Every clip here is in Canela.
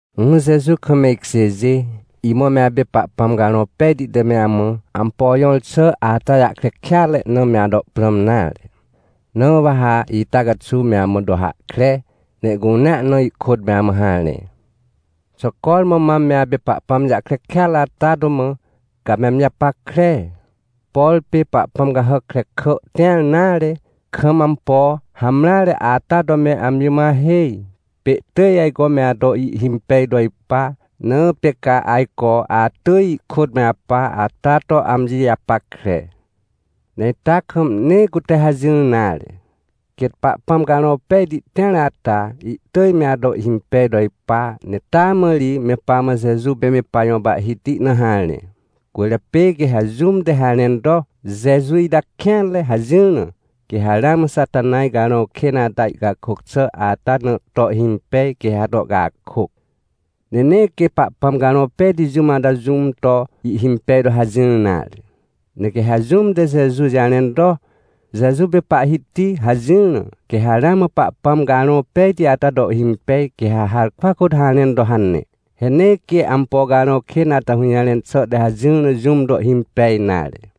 Ỹhỹ Jeju kam me ikjêjê, imã me apê Pahpãm Carõ Pejti te me amã ampo jõr xà ata jahkre kêatre na me ato prãm nare. Na wa ha ita caxuw me amã to hahkre, ne ihcunea na ihkôt me amã harẽ. Xà cormã mam me apê Pahpãm jahkre kêatre ata to mã, ca ame amji japackre? Por pê pahpãm cahàc krekà tĩr nare, kam ampo hamreare ata to me amji mã ahêj, pê ihtỳj ajco me ato ihhimpej to ipa, na pê ca ajco atỳj ihkôt me apa, ata to amji japackre. Ne ita kam nee cute hajỹr nare. Quêt Pahpãm Carõ Pejti tĩar ata, ihtỳj me ato ihhimpej to ipa, ne taa mã ri me pamã Jeju pê me pajõ Pahhiti na harẽ. Cwỳrjapê quê ha jũm te harẽn to: — Jeju ita kêanre — hajỹr na, quê ha ramã Xatanaj carõ kên ata, ihcakôc xà ata na to ihhimpej, quê ha to ihcakôc. Ne nee quê Pahpãm Carõ Pejti jũm ata jũm to ihhimpej to hajỹr nare. Ne quê ha jũm te Jeju jarẽn to: — Jeju pê Pahhiti — hajỹr na, quê ha ramã Pahpãm Carõ Pejti ata to ihhimpej, quê ha harkwa kôt harẽn to hane. He nee quê ampo carõ kên ata hũjarẽn xà te hajỹr na jũm to ihhimpej nare.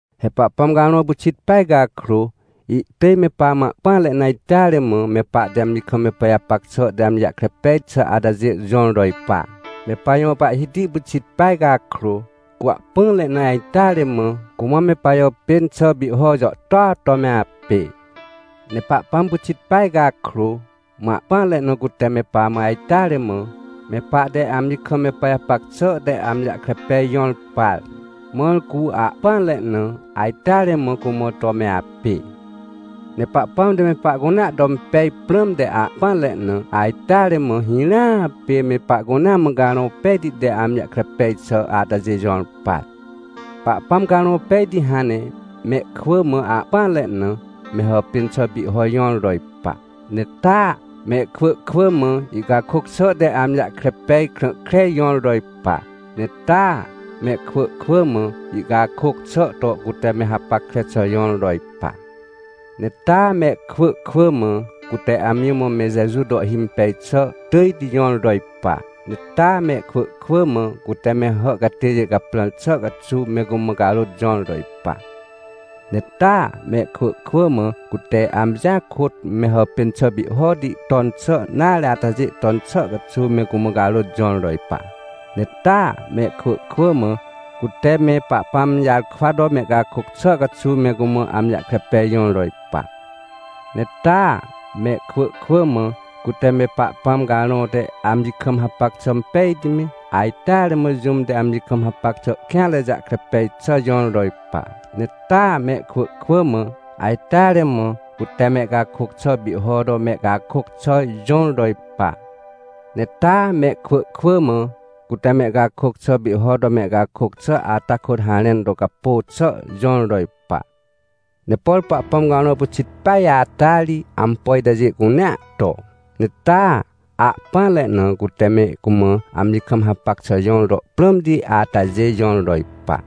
He Pahpãm Carõ pyxit peaj cakrô, ihtỳj me pamã ahpỹanre na ajteare mã, me pahte amji kam me pajapac xà te amji jahkre pej xà atajê jõr to ipa. Me pajõ Pahhiti pyxit peaj cakrô, cu ahpỹanre na ajteare mã, cumã me pajàpên xà pihho jàhtôa to me apê. Ne Pahpãm pyxit peaj cakrô, mã ahpỹanre na cute me pamã ajteare mã, me pahte amji kam me pajapac xà te amji jahkre pej jõr par, mãr cu ahpỹanre na, ajteare mã cumã to me apê. Ne Pahpãm te me pahcunea to impej prãmte ahpỹanre na, ajteare mã, hirãa pê me pahcunea mã Carõ Pejti te amji jahkre pej xà atajê jõr par. Pahpãm Carõ Pejti hãn ne mehkwỳ mã ahpỹanre na, me hàpên xà pihho jõr to ipa. Ne taa, mehkwỳ kwỳ mã, ihcakôc xà te amji jahkre pej krã kreti jõr to ipa. Ne taa, mehkwỳ kwỳ mã, ihcakôc xà to cute me hapackre xà jõr to ipa. Ne taa, mehkwỳ kwỳ mã, cute amji mã me Jeju to ihhimpej xà tỳjti jõr to ipa. Ne taa, mehkwỳ kwỳ mã cute me hà catêjê caprãr xà caxuw me cumã carôt jõr to ipa. Ne taa, mehkwỳ kwỳ mã, cute amjia kôt me hàpên xà pihhoti ton xà nare atajê ton xà caxuw me cumã carôt jõr to ipa. Ne taa, mehkwỳ kwỳ mã, cute me Pahpãm jarkwa to mehcakôc xà caxuw me cumã amji jahkre pej jõr to ipa. Ne taa, mehkwỳ kwỳ mã, cute me Pahpãm Carõ te amji kam hapac xà pejti me, ajteare mã jũm te amji kam hapac xà kêanre jahkre pej xà jõr to ipa. Ne taa, mehkwỳ kwỳ mã, ajteare mã cute mehcakôc xà pihho to mehcakôc xà jõr to ipa. Ne taa, mehkwỳ kwỳ mã, cute mehcakôc xà pihho to mehcakôc xà ata kôt harẽn to capô xà jõr to ipa. Ne por Pahpãm Carõ pyxit peaj ata ri, ampo itajê cunea to. Ne taa, ahpỹanre na cute me cumã amji kam hapac xà jõr to prãmti atajê jõr to ipa.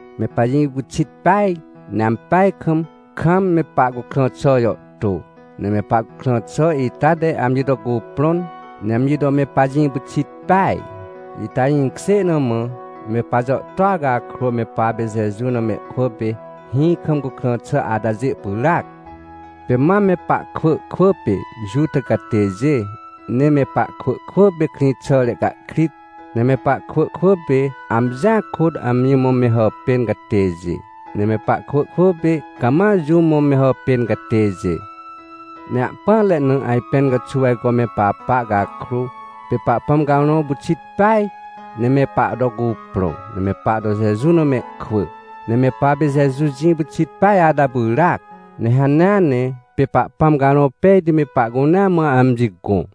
Me pajĩ pyxit peaj, ne ampeaj kam, kam me pahcukrã xà jàhtô, ne me pahcukrã xà ita te amji to cuprõn, ne amji to me pajĩ pyxit peaj. Ita jĩkjê na mã, me pajàhtôa cakrô me papê Jeju na mehkwỳ pê hĩ kam cukrã xà atajê pyràac. Pê mam me pahkwỳ kwỳ pê Juta catêjê, ne me pahkwỳ kwỳ pê krĩxàre cahkrit, ne me pahkwỳ kwỳ pê amjia kôt amji mã me hàpên catêjê, ne me pahkwỳ kwỳ pê cama jũm mã me hàpên catêjê. Ne ahpỹanre na ajpẽn caxuw ajco me papa cakrô, pê Pahpãm Carõ pyxit peaj, ne me pahto cuprõ, ne me pahto Jeju na mehkwỳ. Ne me papê Jeju jĩ pyxit peaj ata pyràac. Ne hanea ne pê Pahpãm Carõ Pejti me pahcunea mã amji gõ.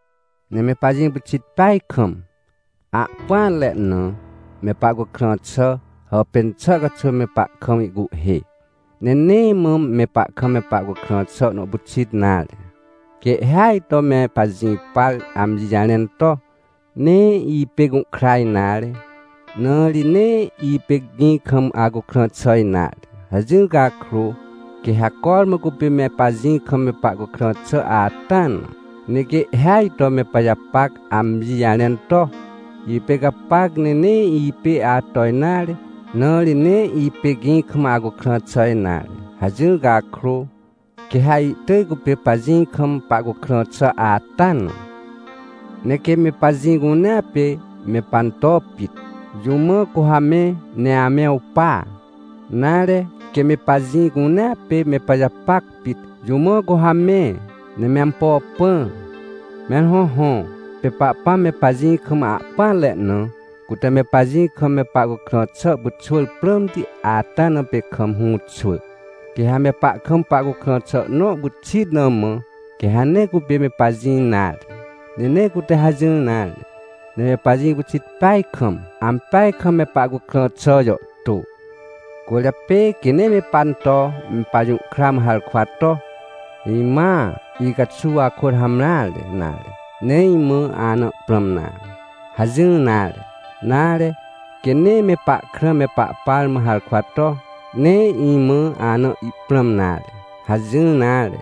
Ne me pajĩ pyxit peaj kam, ahpỹanre na me pahcukrã xà, hàpên xà caxuw, me pahkam ihcuhhê. Ne nee mã me pahkam me pahcukrã xà nõ pyxit nare. Quê ihhêaj to me pajĩ par amji jarẽn to: — Nee ipê gũhkra nare, na ri nee ipê gĩ kam acukrã xà nare — hajỹr cakrô, quê ha cormã cupê me pajĩ kam me pahcukrã xà ata na. Ne quê ihhêaj to me pajapac amji jarẽn to: — Ipê gapac ne nee ipê ato nare, na ri nee ipê gĩ kam acukrã xà nare — hajỹr cakrô, quê ha ihtỳj cupê pajĩ kam pahcukrã xà ata na. Ne quê me pajĩ cunea pê me panto pit, jũ mã cu ha me, ne ame awpa? Nare quê me pajĩ cunea pê me pajapac pit, jũ mã cu ha me, ne me ampo pã? Mẽr hõhõ, pê Pahpãm me pajĩ kam ahpỹanre na, cute me pajĩ kam me pahcukrã xà pyxwỳr prãmti ata na pê kam hũxwỳ. Quê ha me pahkam pahcukrã xà nõ pyxit na mã, quê ha nee cupê me pajĩ nare. Ne nee cute hajỹr nare, ne me pajĩ pyxit peaj kam, ampeaj kam me pahcukrã xà jàhtô. Cwỳrjapê quê nee me panto me pajũhkra mã harkwa to: — Imãa icaxuw akôt hamreare, nare, nee imã ana ihprãm nare — hajỹr nare. Nare, quê nee me pahkrã me pahpar mã harkwa to: — Nee imã ana ihprãm nare — hajỹr nare.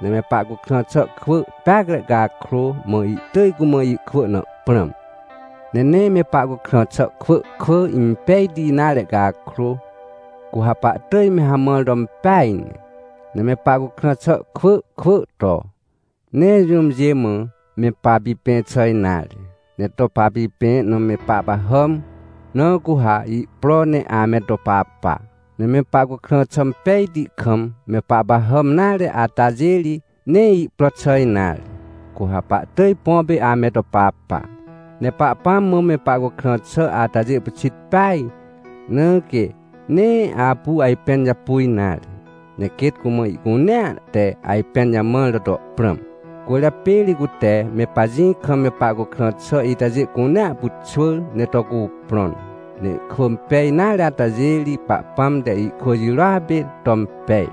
Ne me pahcukrã xà kwỳ peacre cakrô, mã ihtỳj cumã ihkwỳ na ihprãm. Ne nee me pahcukrã xà kwỳ kwỳ impejti nare cakrô, cu ha pahtỳj me hamãr to impeaj ne. Ne me pahcukrã xà kwỳ kwỳ to, nee jũmjê mã me papipẽ xà nare, ne to papipẽ na me pahpahàm, na cu ha ihpro ne ame to papa. Ne me pahcukrã xà impejti kam me pahpahàm nare atajê ri, nee ihpro xà nare, cu ha pahtỳj põ pê ame to papa. Ne Pahpãm mã me pahcukrã xà atajê pyxit peaj, na quê nee apu ajpẽn japu nare, ne quêt cumã ihcunea te ajpẽn jamãr na to prãm. Cwỳrjapê ri cute me pajĩ kam me pahcukrã xà itajê cunea pyxwỳr, ne to cuprõn. Ne ihkwỳ impej nare atajê ri, Pahpãm te ihkwỳ jirôa pê to impej.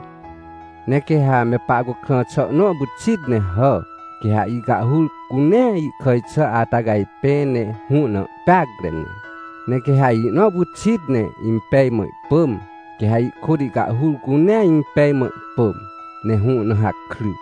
Ne quê ha me pahcukrã xà nõ pyxit ne hà, quê ha ihcahhur cunea ihkàj xà ata cajpẽ, ne hũ na ihpeacre ne. Ne quê ha ihnõ pyxit ne impej mã ihpỳm, quê ha ihkôt ihcahhur cunea impej mã ihpỳm, ne hũ na hakry.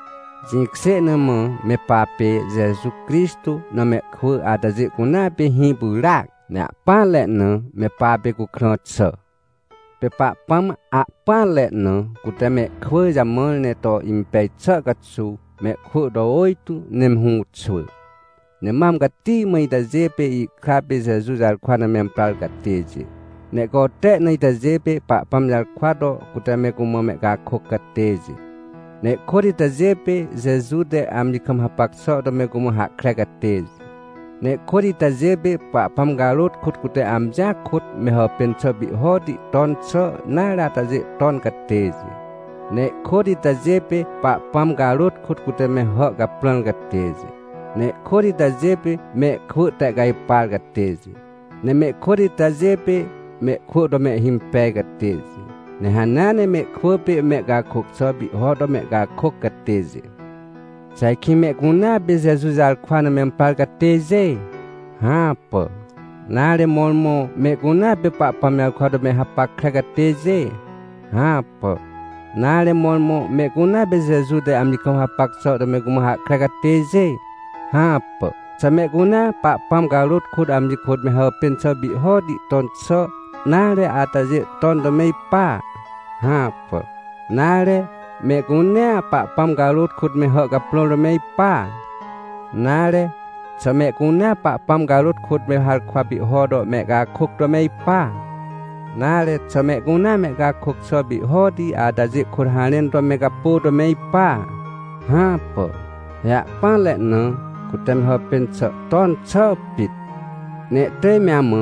Jĩkjê na mã me papê Jeju Crixtô na mehkwỳ atajê cunea pê hĩ pyràac, ne ahpỹanre na me papê cukrã xà. Pê Pahpãm ahpỹanre na cute mehkwỳ jamãr ne to impej xà caxuw, mehkwỳ to ôjtô ne me hũxwỳ. Ne mam cati mã itajê pê ihkra pê Jeju jarkwa na memprar catêjê. Ne ihcote na itajê pê, Pahpãm jarkwa to cute me cumã mehcakôc catêjê. Ne ihkôt itajê pê, Jeju te amji kam hapac xà to me cumã hahkre catêjê. Ne ihkôt itajê pê, Pahpãm carôt kôt cute amjia kôt me hàpên xà pihhoti ton xà nare atajê ton catêjê. Ne ihkôt itajê pê, Pahpãm carôt kôt cute me hà caprãr catêjê. Ne ihkôt itajê pê, mehkwỳ tehcajpar catêjê. Ne mehkôt itajê pê, mehkwỳ to mehhimpej catêjê. Ne hanea ne mehkwỳ pê mehcakôc xà pihho to mehcakôc catêjê. Xà ajkĩ mehcunea pê Jeju jarkwa na memprar catêjê? Hãpà! Nare mõrmõ, mehcunea pê Pahpãm jarkwa to me hapackre catêjê? Hãpà. Nare, mõrmõ, mehcunea pê Jeju te amji kam hapac xà to me cumã hahkre catêjê? Hãpà. Xà mehcunea Pahpãm carôt kôt amji kôt me hàpên xà pihhoti ton xà nare atajê ton to me ipa? Hãpà. Nare, mehcunea Pahpãm carôt kôt me hà caprãr to me ipa? Nare, xà mehcunea Pahpãm carôt kôt me harkwa pihho to mehcakôc to me ipa? Nare, xà mehcunea mehcakôc xà pihhoti atajê kôt harẽn to me capô to me ipa? Hãpà. He ahpỹanre na cute me hàpên xà ton xà pit. Ne ihtỳj me amã,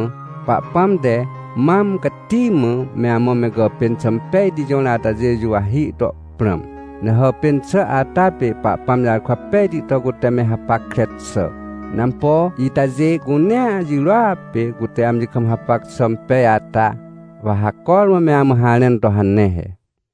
Pahpãm te mam cati mã me amã me gàpên xà impejti jõr atajê juwahi to prãm. Ne hàpên xà ata pê Pahpãm jarkwa pejti to cute me hapackre xà. Ne ampo itajê cunea jirôa pê cute amji kam hapac xà impej ata, wa ha cormã me amã harẽn to hane he.